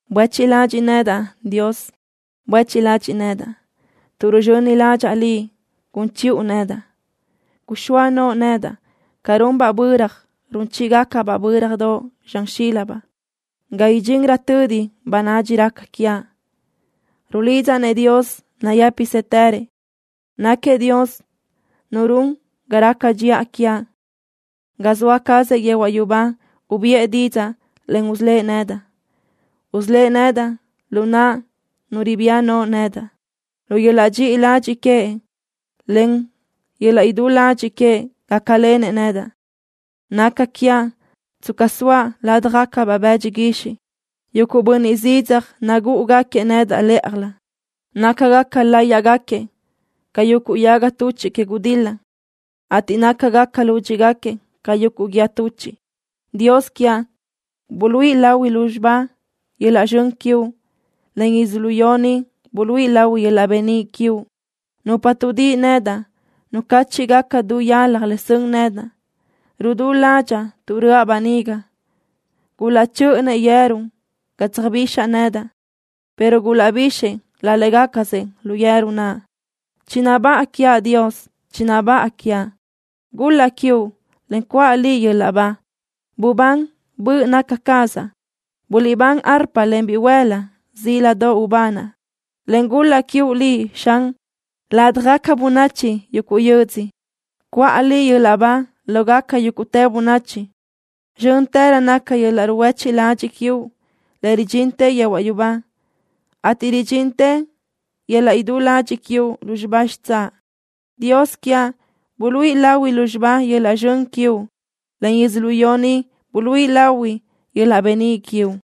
¡Buéchiʼ ladxiʼ nedaʼ, Dios! ¡Buéchiʼ ladxiʼ nedaʼ tuʼ ruzxöni ládxaʼa Liʼ gun chiʼu nedaʼ! Guxóa noʼo nedaʼ ca runbaʼ böra run chíʼigacabaʼ bö́radoʼ zxan xílabaʼ, ga idxinrö tödi bönadxi raca quiaʼ. Rulidzaʼ-nëʼ Dios nayë́pisëtërëʼ. Náquiëʼ Dios Nu run ga raca dxiʼa quiaʼ. Ga zoa cazëʼ yehuaʼ yubá ubiʼë didzaʼ, en usölë́ʼ nedaʼ. Usölë́ʼ nedaʼ lu naʼ nu ribía no nedaʼ. Lu yöl-laʼ dxiʼi ladxiʼ queëʼ, en yöl-laʼ idú ladxiʼ queëʼ gácalenëʼ nedaʼ. Naca quiaʼ tsca zoaʼ ládjagacabaʼ bëdxi guixiʼ. Yuguʼ bönniʼ zidzaj nagúʼugaquiëʼ nedaʼ lë́ʼajlö. Nácagaca láyiʼgaquiëʼ ca yuguʼ yaga tuchiʼ que gudil-la, ateʼ nácagaca lúdxiʼgaquiëʼ ca yuguʼ guíë tuchiʼ. Dios quiaʼ, buluíʼi lahui lúzxiba yöl-laʼ zxön quiuʼ, en yödzölió ni buluíʼi lahui yöl-laʼ beníʼ quiuʼ. Nupa tuʼdíʼi nedaʼ nucáchiʼgaca du yalaj le sön nedaʼ. Rudú ládxaʼa tuʼ röʼa böniga. Gulaʼchö́ʼönëʼ yeru ga tsöjbixaʼ nedaʼ, pero gulaʼbixëʼ laʼ légacasëʼ lu yeru naʼ. ¡Chinabáʼa quiaʼ, Dios! ¡Chinabáʼa quiaʼ! ¡Gul-laʼ quiuʼ, en cuʼa Liʼ yöl-laʼ ba! ¡Bubán, böʼ naca cazaʼ! ¡Guliʼbán arpa, en bihuël-la! ¡Zíladoʼ ubanaʼ, en gul-laʼ quiuʼ Liʼ, Xan, ladaj bönachi yuguʼ yödzö! ¡Cuʼa Liʼ yöl-laʼ ba lógaca yúguʼtë bönachi! Zxö́ntërö naca yöl-laʼ ruhuéchiʼ ladxiʼ quiuʼ, le ridxintë yehuaʼ yubá, ateʼ ridxintë yöl-laʼ idú ladxiʼ quiuʼ lúzxiba xitsáʼ. Dios quiaʼ, buluíʼi lahui lúzxiba yöl-laʼ zxön quiuʼ, en yödzölió ni buluíʼi lahui yöl-laʼ beníʼ quiuʼ.